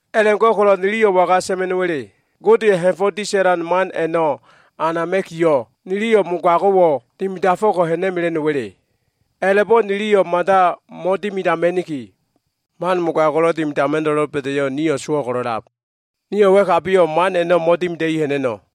A꞉la꞉go꞉ko꞉lo꞉ niliyo꞉ waga sa꞉ma꞉no꞉wa꞉le? Godeya꞉ ha꞉fo꞉ disa꞉lan man a꞉no꞉ anama꞉kiyo꞉, niliyo꞉ mogago꞉wo꞉ dimidafo꞉ko꞉ ha꞉na꞉mela꞉no꞉wa꞉le? A꞉la꞉bo꞉ niliyo꞉ mada mo꞉dimidama꞉niki! Man mogago꞉lo꞉ dimidama꞉no꞉lo꞉ doba꞉da꞉yo꞉, nio꞉ sowo꞉ ko꞉lo꞉lab. Nio꞉ wa꞉kabiyo꞉ man a꞉no꞉ mo꞉dimida꞉i ha꞉na꞉no꞉.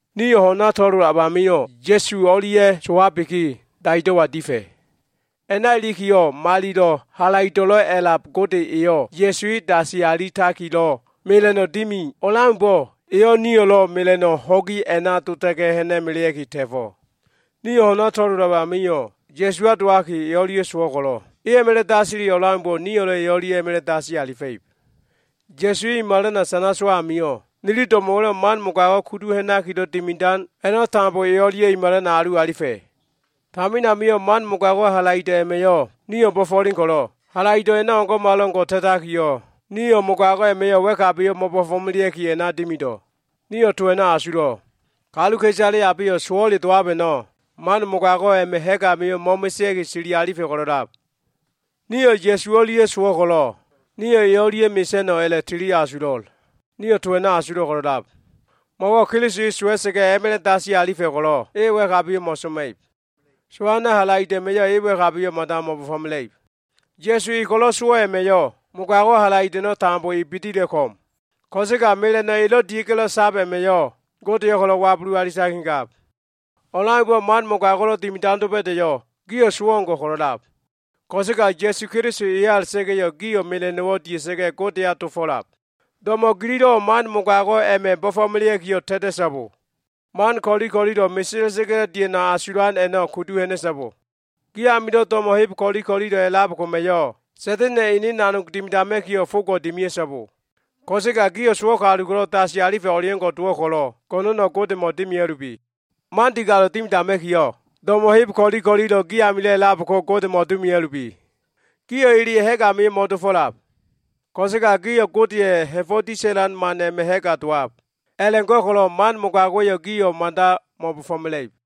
Nio꞉ ho꞉na to꞉lolab amio꞉, Ya꞉su o꞉lia꞉ sowabiki, daido꞉wa difa꞉. A꞉na ilikiyo꞉, malilo꞉ halaido꞉lo꞉ a꞉lab Gode eyo꞉ Ya꞉su e dasi alitakilo꞉ mela꞉no꞉ dimi o꞉leaumbo꞉, eyo꞉ nio꞉lo꞉ mela꞉no꞉ ho꞉gi a꞉na dota꞉ga꞉, ha꞉na꞉melea꞉ki ta꞉fo꞉. Nio꞉ ho꞉na to꞉lolab amio꞉, Ya꞉suwa dowaki e o꞉lia꞉ sowo꞉ ko꞉lo꞉, e a꞉ma꞉la꞉ dasili o꞉leaumbo꞉ nio꞉lo꞉ e o꞉lia꞉ a꞉ma꞉la꞉ dasi alifa꞉ib. Ya꞉su e i malana sana sowo꞉ amio꞉, nili do꞉mo꞉wa꞉lo꞉ man mogago꞉ kudu ha꞉nakilo꞉ dimidan a꞉no꞉ tambo e o꞉lia꞉ i malana alu alifa꞉. Tamin amio꞉ man mogago꞉wa꞉ halaido꞉ a꞉ma꞉yo꞉ nio꞉ bo꞉fo꞉len ko꞉lo꞉, halaido꞉ a꞉no꞉ o꞉ngo꞉malo꞉ngo꞉ ta꞉takiyo꞉, nio꞉ mogago꞉ a꞉ma꞉yo꞉ wa꞉kabiyo꞉ mo꞉bo꞉fo꞉melea꞉ki a꞉na dimido꞉. Nio꞉ to a꞉no꞉ asulo꞉. Kaluka꞉isale abeyo꞉ sowo꞉le dowab a꞉no꞉ man mogago꞉ a꞉ma꞉ ha꞉g amio꞉ mo꞉mesea꞉ki sili alifa꞉ ko꞉lo꞉lab. Nio꞉ Ya꞉su o꞉lia꞉ sowo꞉ ko꞉lo꞉, nio꞉ e o꞉lia꞉ mesa꞉no꞉ a꞉la꞉tili asulo꞉l. Nio꞉ to a꞉no꞉ asulo꞉ ko꞉lo꞉lab. Mo꞉wo꞉ Keliso e sowa꞉sa꞉ga꞉ a꞉ma꞉la꞉ dasi alifa꞉ ko꞉lo꞉, e wa꞉kabiyo꞉ mo꞉soma꞉ib. Sowana꞉ halaido꞉ a꞉ma꞉yo꞉ e wa꞉kabiyo꞉ mada mo꞉bo꞉fo꞉mela꞉ib. Ya꞉su e ko꞉lo꞉ sowo꞉ a꞉ma꞉yo꞉, mogago꞉wa꞉ halaido꞉ a꞉no꞉ tambo e bidila꞉ ko꞉m. Ko꞉sega mela꞉no꞉ elo꞉ dia꞉ga꞉lo꞉ sab a꞉ma꞉yo꞉, Godeyo꞉ ko꞉lo꞉ wabulu alitakigab. O꞉leaumbo꞉, man mogago꞉lo꞉ dimidan doba꞉da꞉yo꞉, gio꞉ sowo꞉ o꞉ngo꞉ ko꞉lo꞉lab. Ko꞉sega Ya꞉su Keliso eya a꞉la꞉ta꞉ga꞉yo꞉, gio꞉ mela꞉no꞉wo꞉ dia꞉ga꞉ Godeya dofo꞉lab. Do꞉mo꞉ gililo꞉wo꞉ man mogago꞉ a꞉ma꞉ bo꞉fo꞉melea꞉kiyo꞉ ta꞉ta꞉so꞉bo. Man ko꞉li ko꞉lilo꞉ mesela꞉sa꞉ga꞉lo꞉ dia꞉no꞉ asulan a꞉no꞉ kudu ha꞉na꞉so꞉bo. Gi amilo꞉ do꞉mo꞉ heb ko꞉li ko꞉lilo꞉ a꞉lab koma꞉yo꞉ Sa꞉da꞉na꞉ya꞉ ene nanog dimidama꞉kiyo꞉, fogo꞉ dimia꞉so꞉bo. Ko꞉sega gio꞉ sowo꞉ kalu ko꞉lo꞉ dasi alifa꞉ o꞉leo꞉ngo꞉ dowo꞉ ko꞉lo꞉, go꞉no꞉no꞉ Godemo꞉ dimia꞉lubi. Man digalo꞉ dimidama꞉kiyo꞉, do꞉mo꞉ heb ko꞉li ko꞉lilo꞉ gi amilo꞉ a꞉lab ko Godemo꞉ dimia꞉lubi. Gio꞉ eleya꞉ ha꞉g amio꞉ mo꞉dofo꞉lab. Ko꞉sega gio꞉ Godeya꞉ ha꞉fo꞉ disa꞉lan man a꞉ma꞉ ha꞉ga dowab. A꞉la꞉go꞉ko꞉lo꞉ man mogago꞉wa꞉yo꞉ gio꞉ mada mo꞉bo꞉fo꞉mela꞉ib.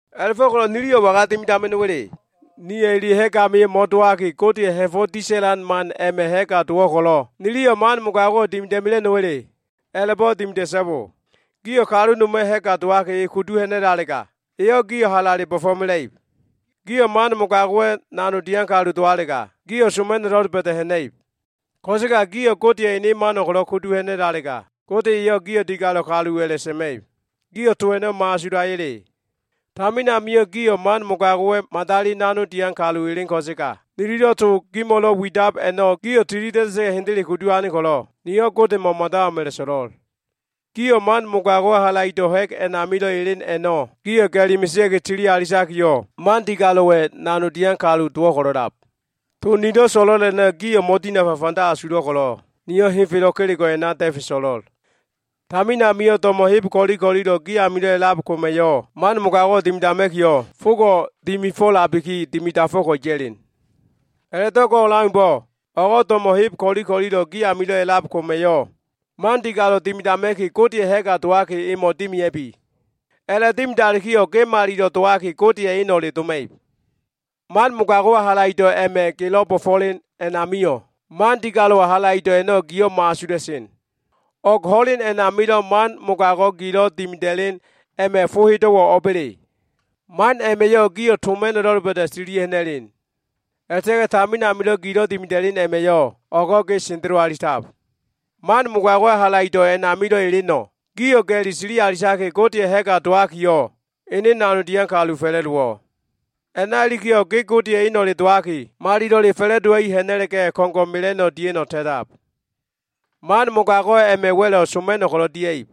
A꞉la꞉fo꞉ko꞉lo꞉ niliyo꞉ waga dimidama꞉no꞉wa꞉le? Nio꞉ eleya꞉ ha꞉g amio꞉ mo꞉dowaki, Godeya꞉ ha꞉fo꞉ disa꞉lan man a꞉ma꞉ ha꞉ga dowo꞉ ko꞉lo꞉, niliyo꞉ man mogago꞉wo꞉ dimida꞉ mela꞉no꞉wa꞉le? A꞉la꞉bo꞉ dimida꞉so꞉bo. Gio꞉ kalu noma꞉ ha꞉ga dowaki e kudu ha꞉na꞉lalega, eyo꞉ gio꞉ halale bo꞉fo꞉mela꞉ib. Gio꞉ man mogago꞉wa꞉ nanog dian kalu dowalega, gio꞉ soma꞉no꞉lo꞉ doba꞉da꞉ ha꞉na꞉ib. Ko꞉sega gio꞉ Godeya꞉ ene mano꞉ ko꞉lo꞉ kudu ha꞉na꞉lalega, Gode eyo꞉ gio꞉ digalo꞉ kalu a꞉la꞉sa꞉ma꞉ib. Gio꞉ to a꞉no꞉ mo꞉asulaya꞉le? Tamin amio꞉ gio꞉ man mogago꞉wa꞉ madali nanog dian kalu elen ko꞉sega, nililo꞉ to gimo꞉lo꞉ widab a꞉no꞉, gio꞉ tilida꞉da꞉sa꞉ga꞉ hendele kudu ane ko꞉lo꞉, niyo꞉ Godemo꞉wo꞉ mada o꞉m a꞉la꞉so꞉lo꞉l. Gio꞉ man mogago꞉wa꞉ halaido꞉ ha꞉g a꞉namilo꞉ elen a꞉no꞉ gio꞉ ga꞉li mesea꞉ki sili alitakiyo꞉, man digalo꞉wa꞉ nanog dian kalu dowo꞉ ko꞉lo꞉lab. To nilo꞉ so꞉lo꞉l a꞉no꞉ gio꞉ mo꞉dinafa fanda asulo꞉ ko꞉lo꞉, niyo꞉ henfelo꞉ kelego꞉ a꞉na da꞉fe so꞉lo꞉l. Tamin amio꞉ do꞉mo꞉ heb ko꞉li ko꞉lilo꞉ gi amilo꞉ a꞉lab koma꞉yo꞉ man mogago꞉wo꞉ dimidama꞉kiyo꞉, fogo꞉ dimifo꞉labiki, dimidafo꞉ko꞉ ya꞉len. A꞉la꞉do꞉ go꞉ o꞉leaumbo꞉, o꞉go꞉ do꞉mo꞉ heb ko꞉li ko꞉lilo꞉ gi amilo꞉ a꞉lab koma꞉yo꞉ man digalo꞉ dimidama꞉ki, Godeya꞉ ha꞉ga dowaki emo꞉ dimia꞉bi. A꞉la꞉dimidalikiyo꞉, ge malilo꞉ dowaki, Godeya꞉ eno꞉le doma꞉ib. Man mogago꞉wa꞉ halaido꞉ a꞉ma꞉ gelo꞉ bo꞉fo꞉len amio꞉, man digalo꞉wa꞉ halaido꞉ a꞉no꞉ giyo꞉ mo꞉asula꞉sen. O꞉g ho꞉len a꞉namilo꞉ man mogago꞉ gilo꞉ dimida꞉len a꞉ma꞉ fo hedo꞉wo꞉ o꞉ba꞉le? Man a꞉ma꞉yo꞉ gio꞉ soma꞉no꞉lo꞉ doba꞉da꞉ tililia꞉ ha꞉na꞉len. A꞉la꞉ta꞉ga꞉ tamin amilo꞉ gilo꞉ dimida꞉len a꞉ma꞉yo꞉, o꞉go꞉ ge sendelo alitab. Man mogago꞉wa꞉ halaido꞉ a꞉namilo꞉ eleno꞉, gio꞉ ga꞉li sili alitaki, Godeya꞉ ha꞉ga dowakiyo꞉, ene nanog dian kalu fa꞉la꞉dowo꞉. A꞉na ilikiyo꞉, ge Godeya꞉ eno꞉le dowaki, malilo꞉le fa꞉la꞉dowa꞉i ha꞉na꞉la꞉ga꞉, ko꞉ngo꞉ mela꞉no꞉ dia꞉no꞉ ta꞉tab. Man mogago꞉ a꞉ma꞉ wa꞉lo꞉ soma꞉no꞉ ko꞉lo꞉ dia꞉ib.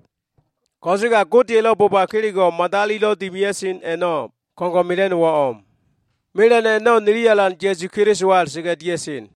Ko꞉sega Godeya꞉lo꞉ boba kelego꞉ ko꞉lo꞉ madalilo꞉ dimia꞉sen a꞉no꞉ ko꞉ngo꞉ mela꞉no꞉wo꞉ o꞉m. Mela꞉no꞉ a꞉no꞉ nili Alan Ya꞉su Kelisowa a꞉la꞉ta꞉ga꞉ dia꞉sen.